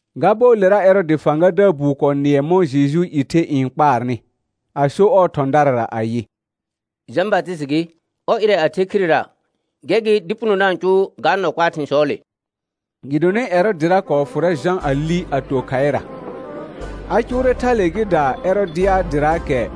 Ga bɔɔlera Ɛrɔɔdɩ fãgadaar buu kɔɔ nɩɛ mɔ̃ Jejuu i the n kpaarnɩ, a so ɔɔ thɔ̃darara ayɩ: Jã Batɩsɩtɩ gɩ, ɔr ɩrɛ a the khirera, gɛr gɩ dɩ puno da-n cʋʋ ga nɔ kpaa thɩ̃sɔɔle. Gɩdonɩ Ɛrɔɔdɩra kɔɔ fʋrɛ Jã a li a to khaɩra. A cʋʋrɛ thale gɩ da Ɛrɔdɩadɩraakɛ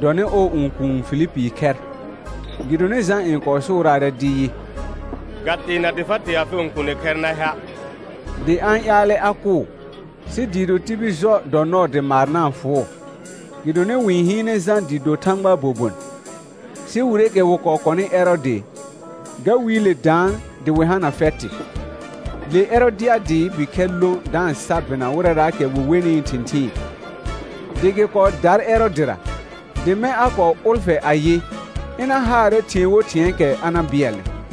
dɔnɩ ɔɔ õkuun Filipii khɛr. Gɩdonɩ Jã n kɔɔ sʋʋraarɛ dɩ yɩ: Ga teena dɩ fa tee afɩ õkuuni khɛr na hea'. Dɩ a-n ƴaalɛ a kʋʋ, sɩ dɩɩ do tibil jɔ dɔ nɔɔ dɩ maar na-n fʋʋ, gɩdonɩ wɩ-n hɩɩnɛ Jã dɩ do Thãgbaa bobon. Sɩ wireekɛ wɩ kɔɔ kɔnɩ Ɛrɔɔdɩ, ga wiile daan dɩ wɩ hana fɛtɩ; le Ɛrɔdɩadɩɩ bikhɛr lõ da-n sa bɩna wɩrɛraakɛ wɩ wenɩɩ thɩ̃thɩɩn, dɩ gɩ kɔɔ dar Ɛrɔɔdɩra; dɩ mɛ̃ a kɔɔ ʋlfɛ ayɩ, ɩna haarɛ thɩ̃ɛ wo thɩ̃ɛɛkɛ a na bɩɛlnɩ.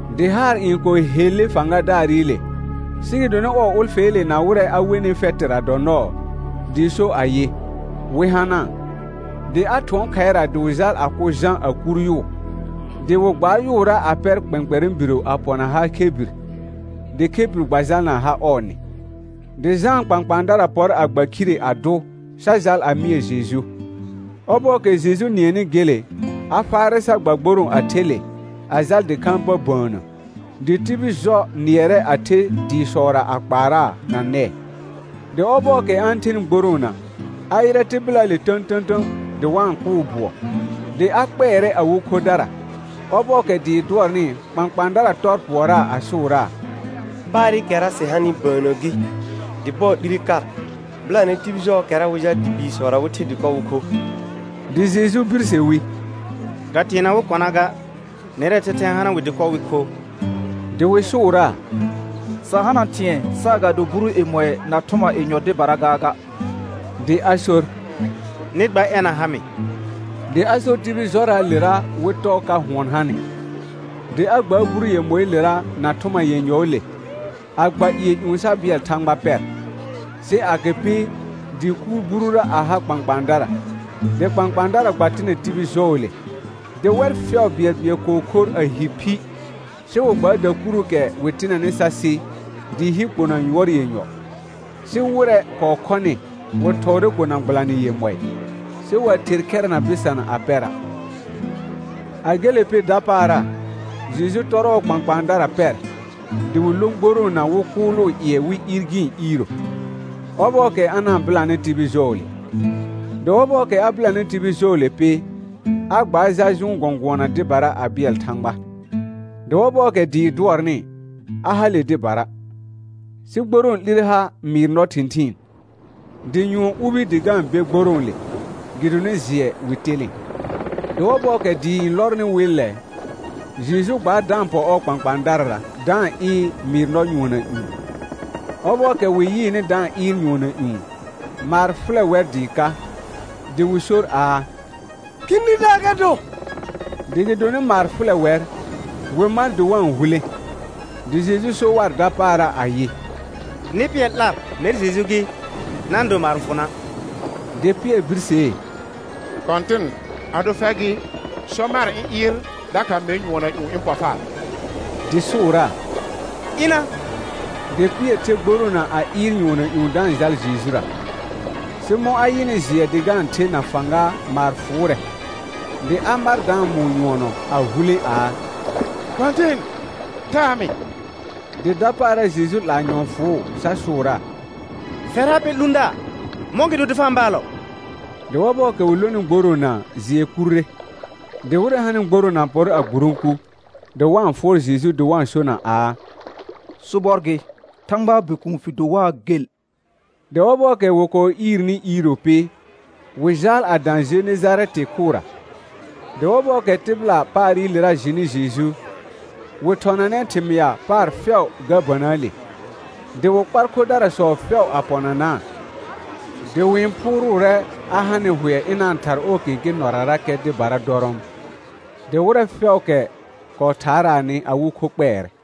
Dɩ haar n kɔɔ helle fãgadaarɩle, sɩ gɩdonɩ ɔɔ ʋlfɛɛle na wɩrɛ a wenɩ fɛtɩra dɔ nɔɔ, dɩ so ayɩ, wɩ hanaa. Dɩ a thʋɔn khaɩra dɩ wɩ jal a kʋ Jã a kur yʋʋ. Dɩ wɩ gbaar yʋʋra a pɛr kpɛ̃kpɛrɛ̃ biro a pɔna ha khebir, dɩ khebir gba jalna ha ɔɔ nɩ. Dɩ Jãa kpãkpãadara pɔr a gba khire a dʋ, sa jal a mɩɛ Jeju. Ɔbɔɔkɛ Jeju nɩɛnɩ gele, a faarɛ sa gba gborõo a the le, a jal dɩkhãa pa bəənnə, dɩ tibil jɔ nɩɛrɛ a the dɩɩsɔra a kpaaraa na nɛɛ. Dɩ ɔbɔɔkɛ a-n thenɩ gboroona, a yɩrɛ tɩbɩlaale tə̃tə̃tə̃ dɩ wa-n kʋʋ bʋɔ, dɩ a kpɛɛrɛ awɩ khodara. Ɔbɔɔkɛ dɩɩ dʋɔrnɩ, kpãkpãadara tɔr pʋɔraa a sʋʋraa: Paarɩkɛra sɩ hanɩ bəənnə gɩ, dɩ bɔɔ 'lire kar. Bɩlanɛ tibil jɔɔkɛra, wɩ jal dɩ biisɔra, wɩ the dɩkɔ wɩ kho. Dɩ Jeju birse wi: Ga teena wɩ kɔna ga, nɛrɛɛ thɛthɛ n hana wɩ dɩkɔ wɩ kho. Dɩ wɩ sʋʋraa: Sa hana thɩ̃ɛ saagado buru yemɔɩ na thʋma yenyɔ dɩbara gaaga. Dɩ a sor: Nɩ gba ɛna ha mɩ. Dɩ a sor tibil jɔraalera wɩ tɔɔ ka hʋɔn hanɩ. Dɩ a gbaar buru yemɔɩɩlera na thʋma yenyɔɔle, a gba ƴɩɛ ƴũ sa bɩɛl Thãgba pɛr. Sɩ agɩpɩ, dɩ kuur burura a ha kpãkpãadara, dɩ kpãkpãadara gba tɩnɛ tibil jɔɔle. Dɩ wɛr fɛʋ bɩɛlbɩɛl kɔɔ khor a hi phi, sɩ wɩ gbaar dakuruukɛ wɩ tɩnɛnɩ sa sɩ, dɩɩ hi kpona yʋɔr yenyɔ. Sɩ wɩrɛ kɔɔ khɔnɩ, wɩ thɔɔrɛ kona gbɩlanɩ yemɔɩ, sɩ wa ther khɛra na bɩsana a pɛra'. A gele pɩ dapaara, Jeju tɔr ɔɔ kpãkpãadara pɛr, dɩ wɩ lõ gboroona wɩ kʋʋlʋʋ ƴɩɛ wɩ iir gɩ̃ iiro, ɔbɔɔkɛ a na-n bɩlanɩ tibil jɔɔle. Dɩ ɔbɔɔkɛ a bɩlanɩ tibil jɔɔle pɩ, a gbaar jal jʋʋn gɔ̃gʋɔna dɩbara a bɩɛl Thãgba. Dɩ ɔbɔɔkɛ dɩɩ dʋɔrnɩ, a hale dɩbara. Sɩ gborõo 'lire ha mɩɩr nɔ thɩ̃thɩɩn, dɩ nyʋɔn ubi dɩ ga-n be gborõole, gɩdonɩ jɩɛ wɩ telẽ. Dɩ ɔbɔɔkɛ dɩɩ n lɔrnɩ wɩllɛ, Jeju gbaar da-n pɔ ɔɔ kpãkpãadarara da-n ɩɩr mɩɩr nɔ nyʋɔnna ƴũ. Ɔbɔɔkɛ wɩ yɩɩnɩ da-n ɩɩr nyʋɔnna ƴũ, maar fʋlɛ wɛr dɩɩ ka, dɩ wɩ sor aa: Khĩdidaar ga do. Dɩ gɩdonɩ maar fʋlɛ wɛr, wɩ mar dɩ wa-n hulẽ. Dɩ Jeju so war dapaara ayɩ: Nɩ pɩɛr 'lar mɛr Jeju gɩ, na-n do maar n fʋ na'. Dɩ Pɩɛr birsee: Kɔ̃tɩn, ado fɛr gɩ, sɔ mar ɩ̃ ɩɩr dakha mer nyʋɔnna ƴũ ɩ̃ pɔ far. Dɩ sʋʋraa: Ɩna. Dɩ Pɩɛr the gboroona a ɩɩr nyʋɔnna ƴũ da-n jal Jejura. Sɩ mɔ̃ a yɩnɩ jɩɛ dɩ ga-n the na fãga maar fʋʋrɛ, dɩ a mar da-n mʋʋ nyʋɔnɔ a hulẽ aa: Kɔ̃tɩn, taa mɩ. Dɩ dapaara Jeju 'laa nyɔ̃ɔ fʋʋ sa sʋʋraa: Fɛr ha pɛ 'lũdaar, mɔ̃gɩdo dɩ fa-n baalɔ? Dɩ ɔbɔɔkɛ wɩ lonɩ gboroona jɩɛ kurre. Dɩ wɩrɛ hanɩ gboroona pɔr a gburõku, dɩ wa-n fʋɔr Jeju dɩ wa-n sona aa: Sobɔr gɩ, Thãgbaa Bikuun fɩ do waa gel. Dɩ ɔbɔɔkɛ wɩ kɔɔ iirni iiro pɩ, wɩ jaal a dã Jenejarɛtɩ khʋra. Dɩ ɔbɔɔkɛ tɩbɩla paarɩlera jɩnɩ Jeju, wɩ thɔnanɛ thɩmɩa paar fɛʋ ga bənəəle. Dɩ wɩ kpar khodarasɔ fɛʋ a pɔnanaa. Dɩ wɩ-n phʋʋrʋʋrɛ a ha nɩ hʋɛ ɩna-n thar ɔɔ kẽkẽ nɔrarakɛ dɩbara dɔrɔɔm. Dɩ wɩrɛ fɛʋʋkɛ kɔɔ thaaraanɩ, awɩ kho kpɛɛrɛ.